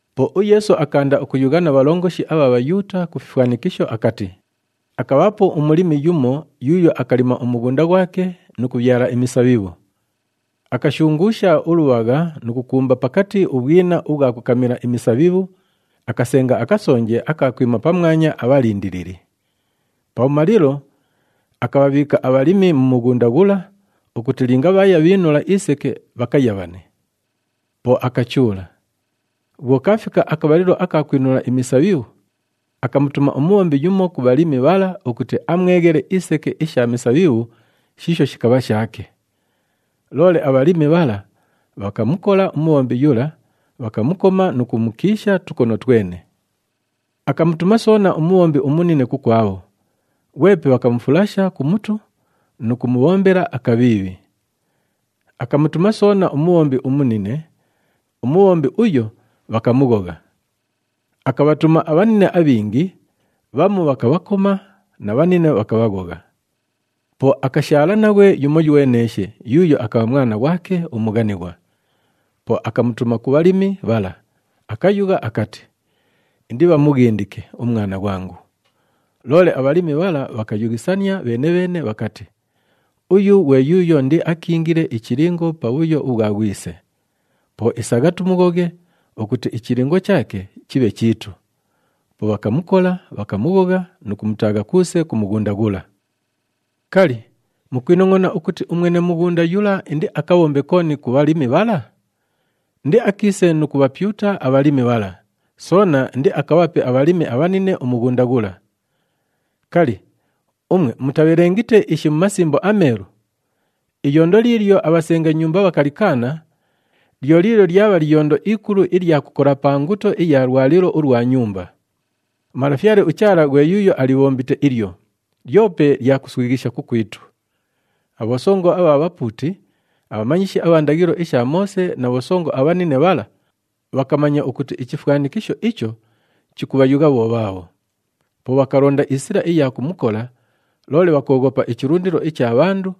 Po uYeesu akaanda ukuyugha na bhalongoshi abha Bhayuuta ku fifwanikisho akati, “Akabhaapo umulimi yumo yuuyo akalima umughunda ghwake nu kubhyala imisabhibhu. Akashunguusha ulubhagha nu kukumba pakati ubhwina ubhwa kukamila imisabhibhu, akasenga akasonje aka kwima pamwanya abhalindilili. Pabhumalilo, akabhabhiika abhalimi mu mughunda ghula ukuti linga bhaaya bhiinula iseke bhakayabhane. Po akachuula. Bhwo kaafika akabhalilo aka kwinula imisabhibhu, akamutuma umubhombi yumo ku bhalimi bhala ukuti amweghele iseke isha misabhibhu shiisho shikabha shaake. Loole abhalimi bhala bhakamukola umubhombi yula, bhakamukoma nu kumukiisha tukono twene. Akamutuma soona umubhombi umunine kukwabho, ghwepe bhakamufulasha ku mutu nu kumubhombela akabhiibhi. Akamutuma soona umubhombi umunine, umubhombi uyo, bhakamughogha. Akabhatuma abhanine abhingi, bhamu bhakabhakoma na bhanine bhakabhaghogha. “Po akashaala naghwe yumoyweneeshe yuuyo akabha mwana ghwake umughanighwa. Po akamutuma ku bhalimi bhala, akayugha akati, ‘Indibhamughindike umwana ghwangu.’ Loole abhalimi bhala bhakayughisania bheene-bheene bhakati, ‘Uyu ghwe yuuyo indiakiingile ichilingo pa bhuyo ubhwa ghwise. Po isagha tumughoghe ukuti ichilingo chaake chibhe chiitu.’ Po bhakamukola, bhakamughogha nu kumutaagha kuuse ku mughunda ghula. “Kali, mukwinongʼona ukuti umwene mughunda yula indiakabhombe kooni ku bhalimi bhala? Indiakiise nu kubhapyuta abhalimi bhala, soona indiakabhape abhalimi abhanine umughunda ghula. Kali, umwe mutabhelengite ishi mu Masimbo aMeelu? ‘Iyondo liilyo abhasenga nyumba bhakalikaana, lyo liilyo lyabha liyondo ikulu ilya kukola pa nguto iya lwalilo ulwa nyumba. UMalafyale uChaala ghwe yuuyo alibhombite ilyo, lyope lya kuswighisha kukwitu.’” Abhosongo abha bhapuuti, abhamanyishi abha ndaghilo isha Moose na bhosongo abhanine bhala bhakamanya ukuti ichifwanikisho icho chikubhayugha bho bhaabho. Po bhakalonda isila iya kumukola, loole bhakooghopa ichilundilo icha bhandu,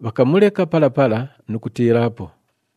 bhakamuleka pala pala nu kutiilaapo.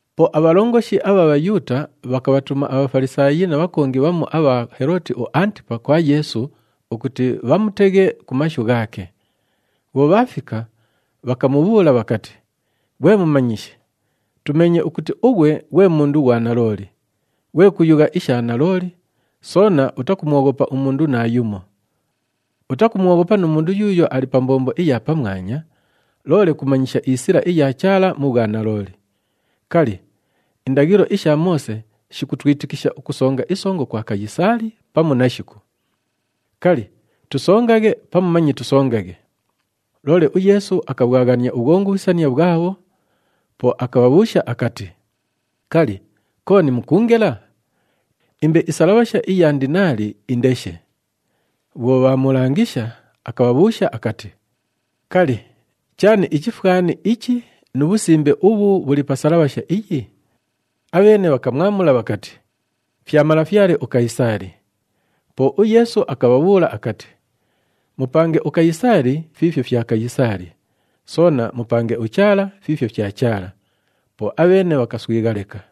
Po abhalongoshi abha Bhayuuta bhakabhatuma aBhafalisaayi na bhakongi bhamu abha Helooti uAntipa kwa Yeesu ukuti bhamuteghe ku mashu ghaake. Bhwo bhaafika, bhakamubhuula bhakati, “Ghwe Mumanyishi, tumeenye ukuti ughwe ghwe mundu ghwa nalooli, ghwe kuyugha isha nalooli, soona utakumwoghopa umundu naayumo. Utakumwoghopa nu mundu yuuyo ali pa mbombo iya pamwanya, loole kumanyisha isila iya Chaala mu bhwanalooli. Kali, indaghilo isha Moose shikutwitikisha ukusonga isongo kwa Kayisaali, pamu nashiku? Kali, tusongaghe pamu manye tusongaghe?” Loole uYeesu akabhwaghania ubhwongubhisania bhwabho, po akabhabhuusha akati, “Kali, kooni mukuungela? Imbe isalabhasha iya ndinaali indeshe.” Bhwo bhaamulangisha, akabhabhuusha akati, “Kali, chaani ichifwani ichi nu bhusimbe ubhu bhuli pa salabhasha iyi?” Abheene bhakamwamula bhakati, “Fya malafyale uKayisaali.” Po uYeesu akabhabhuula akati, “Mupange uKayisaali fiifyo fya Kayisaali, soona mupange uChaala fiifyo fya Chaala.” Po abheene bhakamuswigha leka.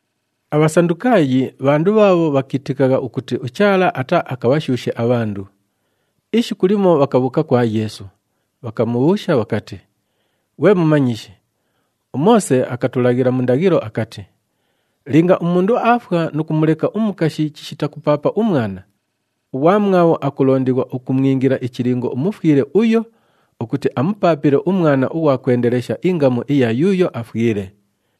ABhasandukaayi bhandu bhaabho bhakiitikagha ukuti uChaala ataaakabhashuushe abhandu. Ishiku limo bhakabhuuka kwa Yeesu, bhakamubhuusha bhakati, “Ghwe Mumanyishi, uMoose akatulaghila mu ndaghilo akati, ‘Linga umundu aafwa nu kumuleka umukashi chishita kupaapa umwana, ughwamwabho akulondighwa ukumwingila ichilingo umufwile uyo ukuti amupaapile umwana ughwa kwendelesha ingamu iya yuuyo afwile.’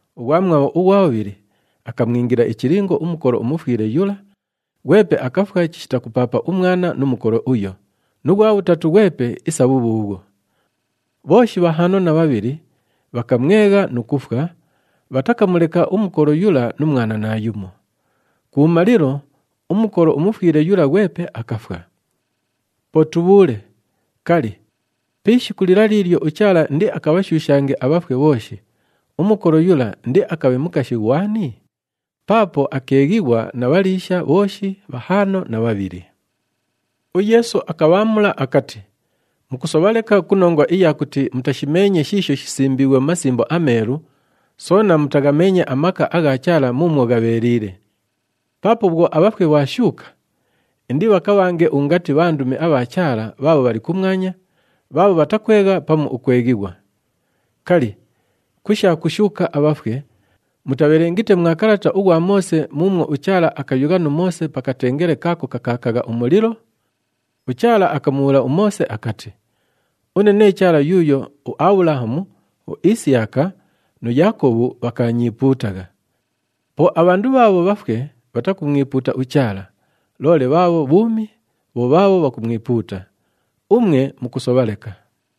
Ughwamwabho ughwa bhubhili akamwingila ichilingo umukolo umufwile yula, ghwepe akafwa chishita kupaapa umwana nu mukolo uyo, nu ghwa bhutatu ghwepe isa bhubhuubhwo. Bhooshi bhahaano na bhabhili bhakamwegha nu kufwa, bhatakamuleka umukolo yula nu mwana naayumo. Kubhumalilo, umukolo umufwile yula ghwepe akafwa. Po tubhuule, kali, pi ishiku lila liilyo uChaala indiakabhashuushange abhafwe bhooshi, umukolo yula indiakabhe mukashi ghwani? Paapo akeeghighwa na bhaliisha bhooshi bhahaano na bhabhili!” UYeesu akabhaamula akati, “Mukusobha leka ku nongwa iya kuti mutashimeenye shiisho shisimbiighwe mu Masimbo aMeelu, soona mutaghameenye amaka agha Chaala muumwo ghabheeliile. Paapo bhwo abhafwe bhaashuuka, indibhakabhange ungati bhandumi abha Chaala bhaabho bhali kumwanya, bhaabho bhatakwegha pamu ukweghighwa. Kali, ku sha kushuuka abhafwe, mutabhelengite mwa kalata ughwa Moose muumwo uChaala akayugha nu Moose pa katengele kaako kakaakagha umulilo? UChaala akamubhuula uMoose akati, ‘Une nee Chaala yuuyo uAbhulahamu, uIsiyaka nu Yaakobhu bhakaanyiipuutagha.’ Po abhandu bhaabho bhafwe bhatakumwipuuta uChaala, loole bhaabho bhuumi bho bhaabho bhakumwipuuta. Umwe mukusobha leka.”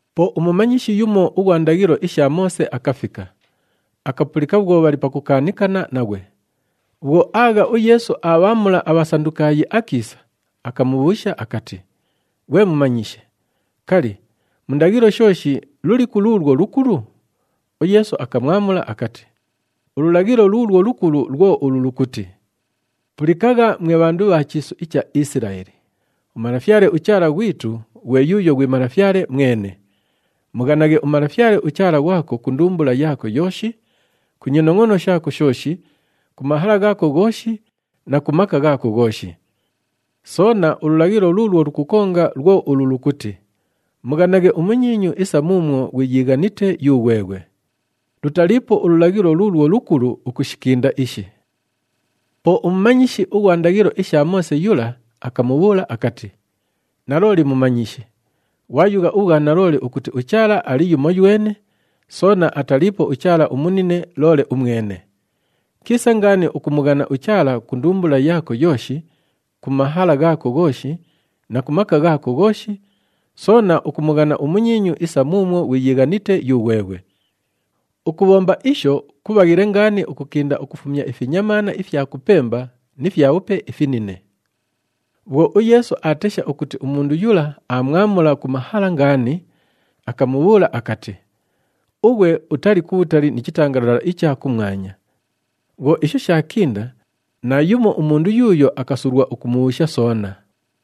Po umumanyishi yumo ughwa ndaghilo isha Moose akafika, akapulika bhwo bhali pakukaanikana naghwe. Bhwo aagha uYeesu aabhaamula aBhasandukaayi akiisa, akamubhuusha akati, “Ghwe Mumanyishi, kali, mu ndaghilo shooshi, luliku luulwo lukulu?” UYeesu akamwamula akati, “Ululaghilo luulwo lukulu lwo ulu lukuti, ‘Pulikagha mwe bhandu bha chiisu icha Isilaeli! UMalafyale uChaala ghwitu ghwe yuuyo ghwi Malafyale mwene. Mughanaghe uMalafyale uChaala ghwako ku ndumbula yaako yooshi, ku nyinongʼono shaako shooshi, ku mahala ghaako ghooshi na ku maka ghaako ghooshi.’ Soona, ululaghilo luulwo lukukonga lwo ulu lukuti, ‘Mughanaghe umunyiinyu isa muumwo ghwiyiighanite yughweghwe.’ Lutaliipo ululaghilo luulwo lukulu ukushikinda ishi.” Po umumanyishi ughwa ndaghilo isha Moose yula akamubhuula akati, “Nalooli Mumanyishi! Ghwayugha ubhwanalooli ukuti uChaala ali yumoywene, soona ataliipo uChaala umunine loole umwene. Kiisa ngaani ukumughana uChaala ku ndumbula yaako yooshi, ku mahala ghaako ghooshi na ku maka ghaako ghooshi, soona ukumughana umunyiinyu isa muumwo ghwiyiighanite yughweghwe. Ukubhomba isho kubhaghile ngaani ukukinda ukufumya ifinyamaana ifya kupemba ni fyabhupe ifinine.” Bhwo uYeesu aatesha ukuti umundu yula aamwamula ku mahala ngaani, akamubhuula akati, “Ughwe utali kubhutali ni chitangalala icha kumwanya.” Bhwo isho shaakinda, naayumo umundu yuuyo akasulwa ukumubhuusha soona.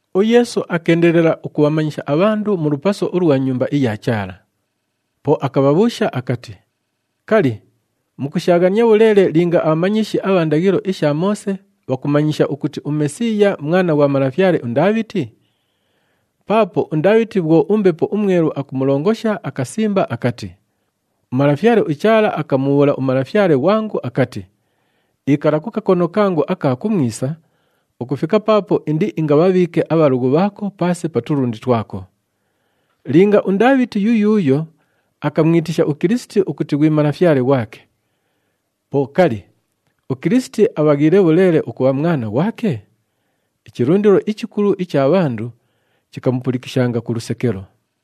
UYeesu akeendelela ukubhamanyisha abhandu mu lupaso ulwa Nyumba iya Chaala. Po akabhabhuusha akati, “Kali, mukushaaghania bhuleele linga abhamanyishi abha ndaghilo isha Moose bhakumanyisha ukuti uMesiiya Mwana ghwa malafyale uNdaabhiti? Paapo uNdaabhiti bhwo uMbepo uMwelu akumulongosha akasimba akati, ‘UMalafyale uChaala akamubhuula uMalafyale ghwangu akati, “Ikala ku kakono kangu aka kumwisa, ukufika paapo indiingabhabhiike abhalughu bhaako paase pa tulundi twako.” ’ “Linga uNdaabhiti yuyuuyo akamwitisha uKilisiti ukuti ghwi Malafyale ghwake, po kali, uKilisiti abhaghiile bhuleele ukubha mwana ghwake?” Ichilundilo ichikulu icha bhandu chikamupulikishanga ku lusekelo.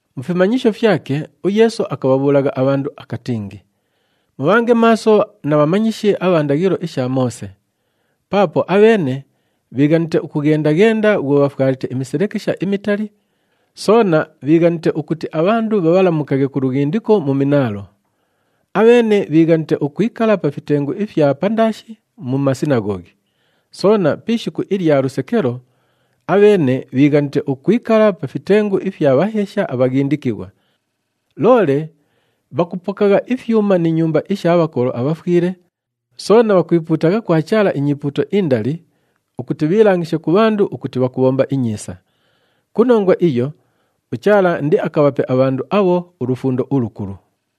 Mu fimanyisho fyake, uYeesu akabhabhuulagha abhandu akatingi, “Mubhange maaso na bhamanyishi abha ndaghilo isha Moose! Paapo abheene bhiighanite ukughenda-ghenda bhwo bhafwalite imiselekesha imitali, soona bhiighanite ukuti abhandu bhabhalamukaghe ku lughindiko mu minaalo. Abheene bhiighanite ukwikala pa fitengu ifya pandaashi mu masinaghoghi. Soona pi ishiku ilya lusekelo, abheene bhiighanite ukwikala pa fitengu ifya bhaheesha abhaghindikighwa. Loole bhakupokagha ifyuma ni nyumba isha bhakolo abhafwile, soona bhakwipuutagha kwa Chaala inyipuuto indali ukuti bhiilangishe ku bhandu ukuti bhakubhomba inyiisa! Ku nongwa iyo, uChaala indiakabhape abhandu abho ulufundo ulukulu.”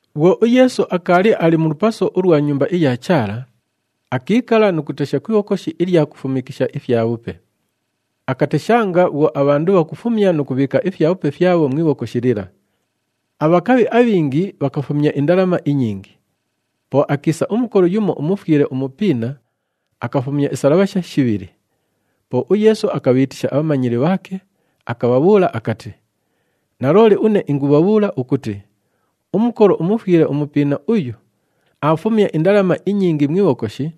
Bhwo uYeesu akaali ali mu lupaso ulwa Nyumba iya Chaala, akiikala nu kutesha ku ibhokoshi ilya kufumikisha ifyabhupe. Akateshanga bhwo abhandu bhakufumya nu kubhiika ifyabhupe fyabho mu ibhokoshi lila. Abhakabhi abhingi bhakafumya indalama inyingi. Po akiisa umukolo yumo umufwile umupiina, akafumya isalabhasha shibhili. Po uYeesu akabhiitisha abhamanyili bhaake, akabhabhuula akati, “Nalooli une ingubhabhuula ukuti, umukolo umufwile umupiina uyu, aafumya indalama inyingi mu ibhokoshi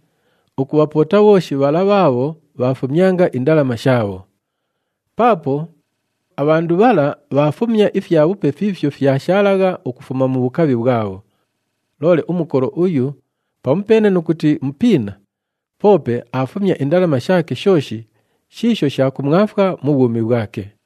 ukubhapoota bhooshi bhala bhaabho bhaafumyanga indalama shaabho. Paapo abhandu bhala bhaafumya ifyabhupe fiifyo fyashaalagha ukufuma mu bhukabhi bhwabho. Loole umukolo uyu pamupeene nu kuti mupiina, poope aafumya indalama shaake shooshi shiisho sha kumwafwa mu bhwumi bhwake.”